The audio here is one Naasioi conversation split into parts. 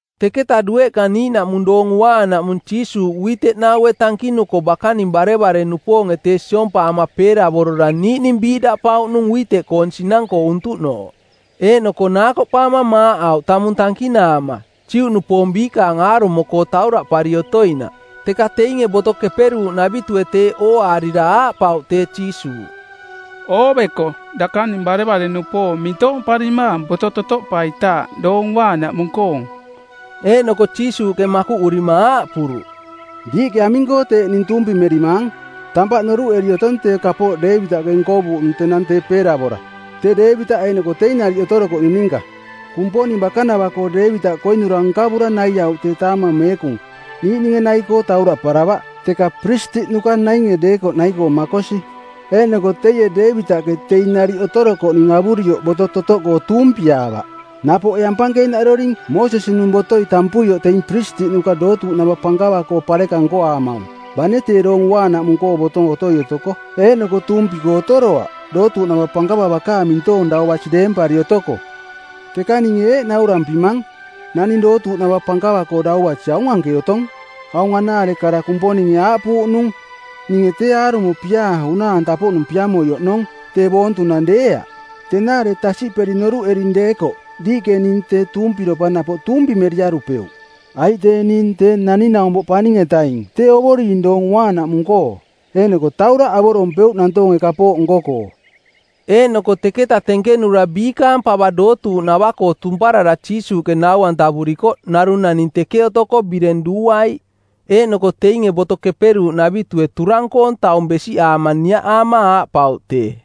Teketa dueꞌka niiꞌnaꞌmung Doong Uaanaꞌmung Jiisuuꞌ uiteꞌnaue˜ tankinuko bakaninge barevare-nupoonge tee siompaama peeravorora niiꞌning biiꞌdaꞌpauꞌnung uiteꞌkoong sinang-koo untuꞌnooꞌ, eeꞌnoko naakoꞌpaama maaꞌauꞌ tamung tankinaama, Juꞌnupoong biikaang aarumo-koo tauraꞌpari otoinaꞌ. Teka teinge Boto Keperuuꞌnavitue˜ teeꞌ ooaarira aaꞌpauꞌ tee Jiisuuꞌ, “Ooveko, dakaning barevare-nupoong mintoomparimaang boto totoꞌpaitaaꞌ Doong Uaanaꞌmung-koong.” Eeꞌnoko Jiisuuꞌke makuꞌurima aaꞌpuruꞌ, “Diiꞌke aming-koo teeꞌ tuumpimerimaang? Tampaꞌ noruꞌeri otong tee kapooꞌ Deevitaꞌke nkovuuꞌnung tenang tee peeravora, tee Deevitaꞌ eeꞌnoko teing nariꞌ otorokoꞌning ninka. Kumponing bakanava-koo Deevitaꞌ koinura nkavura naiauꞌ tee taamang meekung, niiꞌninge nai-koo tauraꞌparavaꞌ, teka piristiꞌnuka nainge deekoꞌ nai-koo makosi. Eeꞌnoko teie Deevitaꞌke teing nariꞌ otorokoꞌning avurioꞌ boto totoꞌkoo tuumpiaavaꞌ. Napoꞌ ee ampankeenaꞌdoring Moosesi-nung botoi tampuioꞌ teing piristiꞌnuka dootuuꞌnava pankava-koo pareka nkoaamaung bane tee Doong Uaanaꞌmung-koong boto otoi otoko, eeꞌnoko tuumpi-koo otoroaꞌ dootuuꞌnava pankava bakaang mintoong dau basi deempari otoko. Teka ninge eeꞌ naurampimang, naning dootuuꞌnava pankava-koo dau basi aung anke otong. Aung anaare kara Kumponinge aaꞌpuuꞌnung, ‘Ninge tee aarumo piaa unaa-anta-poꞌnung piamoi oꞌnong, tee boontunang deeaꞌ.’ Tenaare tasiꞌperi noruꞌering deekoꞌ diiꞌke ning tee tuumpiropa napoꞌ tuumpimeriarupeuꞌ. Aiꞌ tee ning Tee Naning-naumpoꞌ Paning-etaing tee Ovoring Doong Uaanaꞌmung-koo eeꞌnoko tauraꞌ avorompeuꞌ nantoonge kapooꞌ nko-koo.” Eeꞌnoko teketa tenkenura biikaang pava dootuuꞌnava-koo tumparara Jiisuuꞌke nau-antavurikoꞌ narung naning teke otoko bireng duuaiꞌ. Eeꞌnoko teinge Boto Keperuuꞌnavitue turang-koong taung besiꞌaama niaꞌaama aaꞌpauꞌ tee,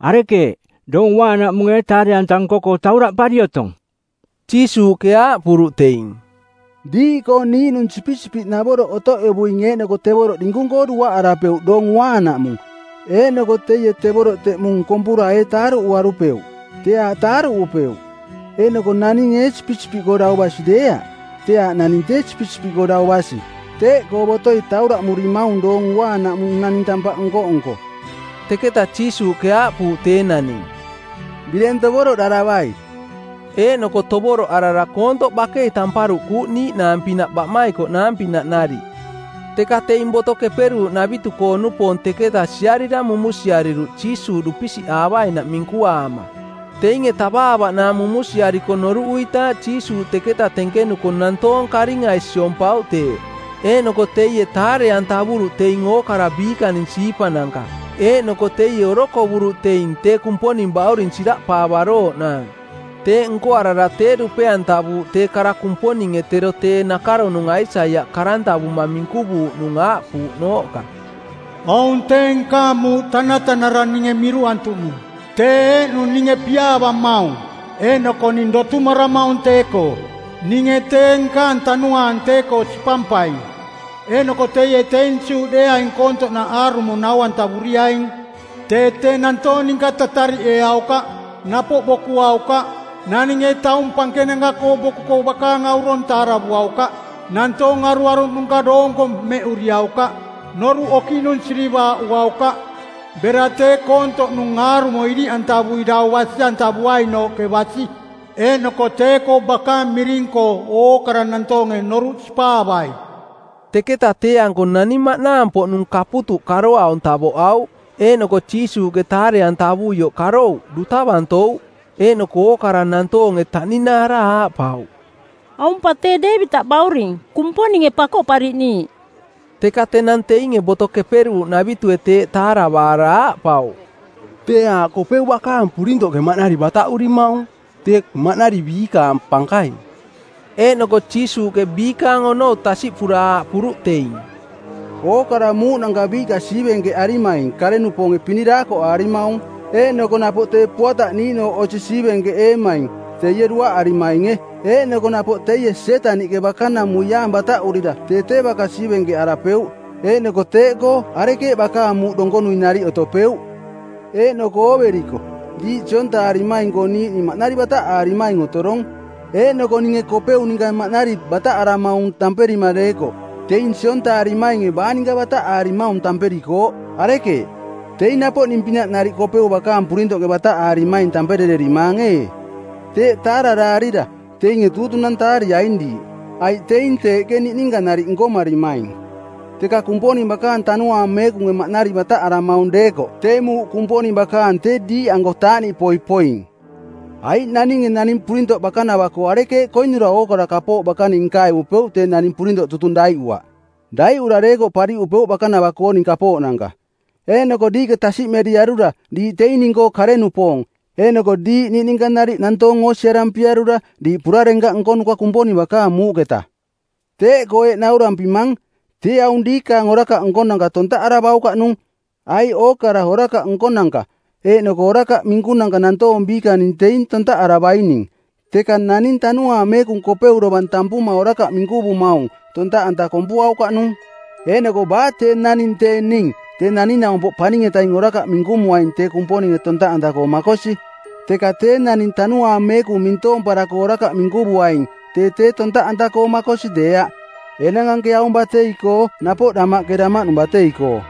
“Arekeeꞌ, Doong Uaanaꞌmung ee taare-anta nko-koo tauraꞌpari otong?” Jiisuuꞌke aaꞌpuruꞌ teing, “Diiꞌkoo niiꞌnung sipisipiꞌnavoroꞌ otoꞌevuing eeꞌnoko tevoroꞌ dinkung-koo duaꞌarapeuꞌ Doong Uaanaꞌmung, eeꞌnoko teie tevoroꞌ teꞌmung kompura ee taaruꞌuarupeuꞌ? Tee aaꞌ taaruꞌupeuꞌ. Eeꞌnoko naning ee sipisipiꞌkoo dau basi deeaꞌ? Tee aaꞌ naning tee sipisipiꞌkoo dau basi. Teeꞌkoo botoi tauraꞌmurimaung Doong Uaanaꞌmung naning tampaꞌ nko-nko.” Teketa Jiisuuꞌke aaꞌpuuꞌ tee naning, “Bireng tovoroꞌdaravai.” Eeꞌnoko tovoroꞌarara koontoꞌ bakei tamparuꞌkuuꞌ niiꞌnaang-pinaꞌ baꞌmaikoꞌnaang-pinaꞌ nariꞌ. Teka teing Boto Keperuuꞌnavitu-koo-nupoong teketa siarira mumunsiariruꞌ Jiisuuꞌ dupisiꞌaavainaꞌ minkuaama. Teinge tavaavaꞌnaang mumunsiariko noruꞌuitaaꞌ Jiisuuꞌ teketa tenkenuko nantoong karingai siompauꞌ tee, eeꞌnoko teie taare-antavuruꞌ teing ookara biikaning siipananka. Eeꞌnoko teie orokovuruꞌ teing tee Kumponing bauring siraꞌpaavarooꞌnaang. Teeꞌ nkoarara tee dupe-antavuuꞌ tee kara Kumponinge tero tee nakaronung Aisaiaꞌ karantavuma˜ minkuvuuꞌnung aaꞌpuuꞌnooꞌka, “Aung tee nkaang muuꞌ tanatanara ninge miruꞌantuꞌnung. Tee eeꞌnung ninge piaavamaung, eeꞌnoko ning dotumaramaung tee-koo. Ninge tee nkaang Tanuaang tee-koo sipampaing eeꞌnoko teie teing Juꞌdeeaing koontoꞌnaꞌ aarumo nau-antavuriaing. Tee tee nantoong ninka tatariꞌeeaukaꞌ, napoꞌ bokuaukaꞌ. Naninge taung pankenanka-koo bokuko bakaang aurong taaravuaukaꞌ. Nantoong aruaruꞌnuka doonko mmeꞌuriaukaꞌ. Noruꞌ okiꞌnung sirivaaꞌuaukaꞌ, bera tee koontoꞌnung aarumo iriꞌantavui dau basi-antavuainooꞌke basi. Eeꞌnoko tee-koo bakaang miring-koo ookara nantoonge noruꞌ sipaavai.” Teketa tee-anko naning maꞌnaang-poꞌnung kaputuꞌ karoaung tavoꞌauꞌ. Eeꞌnoko Jiisuuꞌke taare-antavuioꞌ karouꞌ, duta bantouꞌ. Eeꞌnoko ookara nantoonge taꞌninaara aaꞌpauꞌ, “Aung pa tee Deevitaꞌ bauring, Kumponinge Pakoꞌpariꞌniiꞌ.” Teka tenang teinge Boto Keperuuꞌnavitue teeꞌ taaravaara aaꞌpauꞌ, “Tee aaꞌ Kopeu bakaang purintoꞌke maꞌnari bataꞌurimaung, tee maꞌnari biikaang pankaing.” Eeꞌnoko Jiisuuꞌke biikaang onou tasiꞌpura aaꞌpuruꞌ teing, “Ookara muuꞌnanka biiꞌka siivenkeꞌarimaing kare-nupoonge pini daakoꞌaarimaung. Eeꞌnoko napoꞌ tee puataꞌ niiꞌnooꞌ osi siivenkeꞌeemaing teie duaꞌarimainge. Eeꞌnoko napoꞌ teie Sietaniꞌke bakanamuiaang bataꞌurira tee tee baka siivenkeꞌarapeuꞌ eeꞌnoko teeꞌkoo arekeeꞌ bakaang muuꞌ donkonui nariꞌ otopeuꞌ? Eeꞌnoko ooveriko diiꞌ siontaarimaing-koo niiꞌning maꞌnari bataꞌaarimaing otorong. Eeꞌnoko ninge Kopeu ninka maꞌnari bataꞌaramaung tamperima deekoꞌ teing siontaarimainge baa ninka bataꞌaarimaung tamperikooꞌ? Arekeeꞌ, teing napoꞌ ning-pinaꞌ nariꞌ Kopeu bakaang purintoꞌke bataꞌaarimaing tamperererimaang ee? Teeꞌ taararaarira teinge tuutunantaariaing diiꞌ, aiꞌ teing teeꞌke niꞌninka nariꞌ nkomarimaing. Teka Kumponing bakaang Tanuaang Meekunge maꞌnari bataꞌaramaung deekoꞌ tee muuꞌ Kumponing bakaang tee diiꞌanko taaꞌniꞌpoi poing. “Aiꞌ naninge naning purintoꞌ bakanava-koo arekeeꞌ koinura ookara kapooꞌ bakaning nkavupeuꞌ tee naning purintoꞌ tutung daiꞌuaꞌ? Daiꞌura deekoꞌ pariꞌupeuꞌ bakanava-kooning kapooꞌnanka. Eeꞌnoko diiꞌke tasiꞌmeriarura diiꞌ teing ning-koo kare-nupoong, eeꞌnoko diiꞌ niꞌninka nariꞌ nantoong oosiarampiarura diiꞌ purarenkaꞌ nkonuka Kumponing bakaang muuꞌketa. Teeꞌkoo eeꞌ naurampimang, tee aung diikaang orakaꞌnko tontaꞌaravaukaꞌnung, aiꞌ ookara orakaꞌ nkonanka eeꞌnoko orakaꞌ minkunanka nantoong biikaning teing tontaꞌaravaining, teka naning Tanuaang Meekung Kopeu dovang tampuma orakaꞌ minkuvumaung tontaꞌanta kompuaukaꞌnung. Eeꞌnoko baa tee naning tee ning Tee Naning-naumpoꞌ Paning-etaing orakaꞌ minkumuaing tee Kumponinge tontaꞌanta-koo makosi. Teka tee naning Tanuaang Meekung mintoomparako orakaꞌ minkuvuaing tee tee tontaꞌanta-koo makosi deeaꞌ, enang anke aung batei-koo napoꞌ damaꞌke damaꞌnung batei-koo.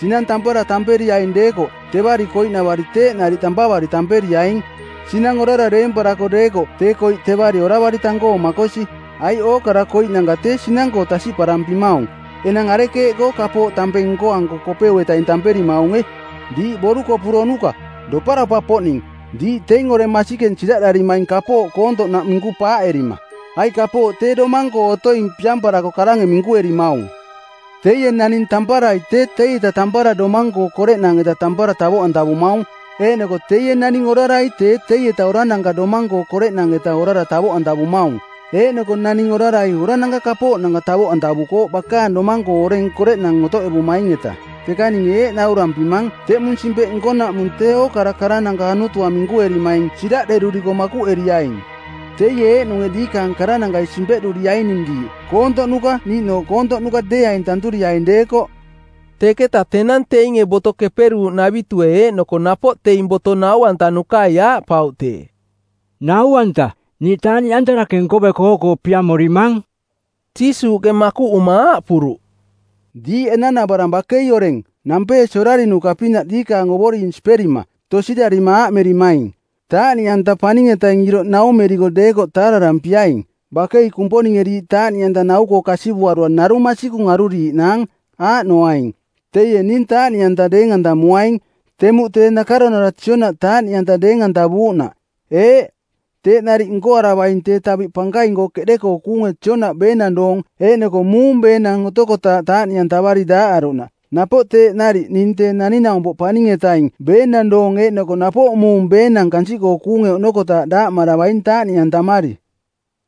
Sinang tampara tamperiaing deekoꞌ tevari koiꞌnavari teeꞌ nariꞌ tampavari tamperiaing. Sinang orara deemparako deekoꞌ tee koiꞌ tevari oravari tang-koo makosi, aiꞌ ookara koiꞌnanka tee sinang-koo tasiꞌparampimaung. Enang arekeeꞌkoo kapooꞌ tampeng nkoanko Kopeu-etaing tamperimaunge? Diiꞌ borukoporonuka doparopa-poꞌning, diiꞌ teing oreng masikeng siraꞌdarimaing kapooꞌ koontoꞌnaꞌ minku paaꞌerima! Aiꞌ kapooꞌ tee domang-koo otoing piamparako karange minkuerimaung. Teie naning tamparai tee teieta tampara domang-koong koreꞌnang-eta tampara tavoꞌantavumaung eeꞌnoko teie naning orarai tee teieta orarananka domang-koong koreꞌnang-eta orara tavoꞌantavumaung. Eeꞌnoko naning orarai orananka kapooꞌnanka tavoꞌantavukooꞌ bakaang domang-koo oreng koreꞌnang otoꞌevumaing-eta. Teka ninge eeꞌ naurampimang, teꞌmung simpeꞌ nkonaꞌmung tee ookara karananka anutua minkuerimaing siraꞌderuriko makuꞌeriaing. Teie eeꞌnunge diikaang karanankai simpeꞌduriaining diiꞌ koontoꞌnuka niiꞌnooꞌ koontoꞌnuka deeaing tanturiaing deekoꞌ.” Teketa tenang teinge Boto Keperuuꞌnavitue eeꞌnoko napoꞌ teing boto nau-antanukai aaꞌpauꞌ tee, “Nau-anta, niiꞌ taaꞌniꞌanta dake nkoveko oo-koo piamorimang.” Jiisuuꞌke makuꞌuma aaꞌpuruꞌ, “Diiꞌ enanavarang bakei oreng, nampeesi orarinuka-pinaꞌ diikaang Ovoring siperima, tosirarima aaꞌmerimaing, ‘Taaꞌniꞌanta paning-etaing iroꞌ naumeriko deekoꞌ taararampiaing.’ Bakei Kumponinge diiꞌ taaꞌniꞌanta nau-koo kasivuarura narung masikung aruriiꞌnaang, aaꞌnoaing: Teie ning taaꞌniꞌanta deeng-antamuaing temuꞌ tee nakaronara Joonaꞌ taaꞌniꞌanta deeng-antavuuꞌnaꞌ. Eeꞌ, teeꞌ nariꞌ nkoaravaing tee taviꞌ pankaing-koo keꞌde-koo kuunge Joonaꞌ beenang doong eeꞌnoko muung beenang otokotaaꞌ taaꞌniꞌantavari daaꞌaruꞌnaꞌ napoꞌ teeꞌ nariꞌ ning Tee Naning-naumpoꞌ Paning-etaing beenang doong eeꞌnoko napoꞌ muung beenang kansiꞌkoo kuunge oꞌnokotaaꞌ daaꞌmaravaing taaꞌniꞌantamari.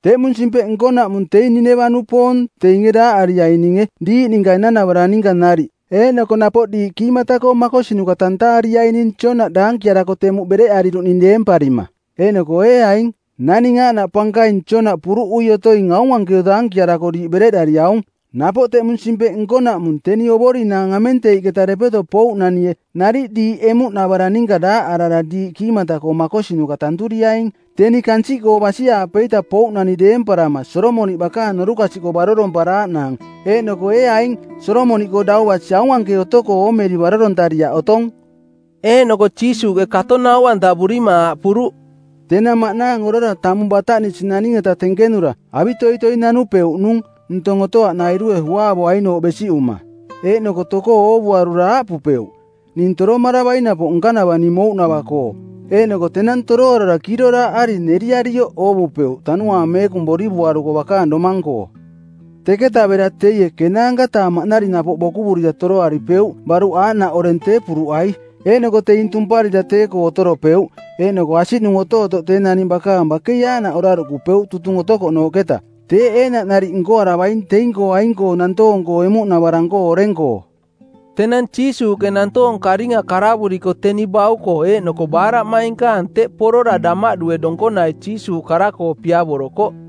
Teꞌmung simpeꞌ nkonaꞌmung teing Nineva-nupoong teinge daaꞌariaininge diiꞌ ninka enanavarang ninka nariꞌ eeꞌnoko napoꞌ diiꞌ kiimata-koo makosinuka tantaariaining Joonaꞌ daankiarako temuꞌ bereꞌariruꞌning deemparima, eeꞌnoko ee aing, naning aaꞌnaꞌ pankaing Joonaꞌ puruꞌui otoing aung anke daankiarako diiꞌ bereꞌdariaung. Napoꞌ teꞌmung simpeꞌ nkonaꞌmung teni ovorinaang amenteiꞌketa depeto pouꞌnanie nariꞌ diiꞌ emuꞌnavarang ninka daaꞌarara diiꞌ kiimata-koo makosinuka tanturiaing, teni kansiꞌkoo basi-aapeita pouꞌnani deemparama Solomoniꞌ bakaang norukasiꞌkoo baroromparaaꞌnaang, eeꞌnoko ee aing Solomoniꞌkoo dau basi aung anke otoko oomeri barorontariaꞌ otong.” Eeꞌnoko Jiisuuꞌke kato nau-antavurima aaꞌpuruꞌ, “Tenang maꞌnaang orara tamung bataꞌnisi naning-eta tenkenura avitoitoi nanupeuꞌnung ntong otoaꞌnairue uaavoainooꞌ besiꞌuma. Eeꞌnoko tokoo oovuarura aaꞌpupeuꞌ, ‘Ning toromaravaing napoꞌ nkanava ning mouꞌnava-koo.’ Eeꞌnoko tenang toroarara kiiroraaꞌari neriarioꞌ oovupeuꞌ Tanuaang Meekung borivuaruko bakaang domang-koo. Teketa bera teie ˜kenaanka-taa maꞌnari napoꞌ bokuvurira toroaripeuꞌ baruꞌ aaꞌnaꞌ oreng tee puruꞌai. Eeꞌnoko teing tumparira tee-koo otoropeuꞌ, eeꞌnoko asiꞌnung otootoꞌ tee naning bakaang bakei aaꞌnaꞌ oraruꞌkupeuꞌ tutung otokoꞌnooꞌketa. Teeꞌ eeꞌnaꞌ nariꞌ nkoaravaing teing-koo aing-koo nantoong-koo emuꞌnavarang-koo oreng-koo.” Tenang Jiisuuꞌke nantoong karinga karavuriko teni bauko eeꞌnoko baaraꞌmainkaang teꞌ porora damaꞌdue donkonai Jiisuuꞌ kara-koo piavorokoꞌ.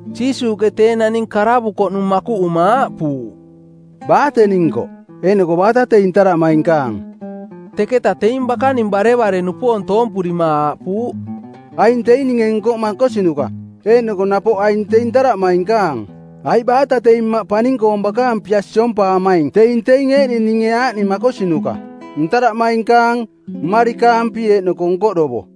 Jiisuuꞌke tee naning karavukoꞌnung makuꞌuma aaꞌpuuꞌ, “Baa teni nkoꞌ, eeꞌnoko baata teing ntaraꞌmainkaang?” Teketa teing bakaning barevare-nupoong toompurima aaꞌpuuꞌ, “Aing teing ninge nkoꞌ makosinuka eeꞌnoko napoꞌ aing teing ntaraꞌmainkaang. Aiꞌ baata teing Mmaꞌ paning-koong bakaang pia siompaamaing teing teing eeꞌning ninge aaꞌning makosinuka: ntaraꞌmainkaang, mmarikaampi eeꞌnoko nkoꞌdovo.”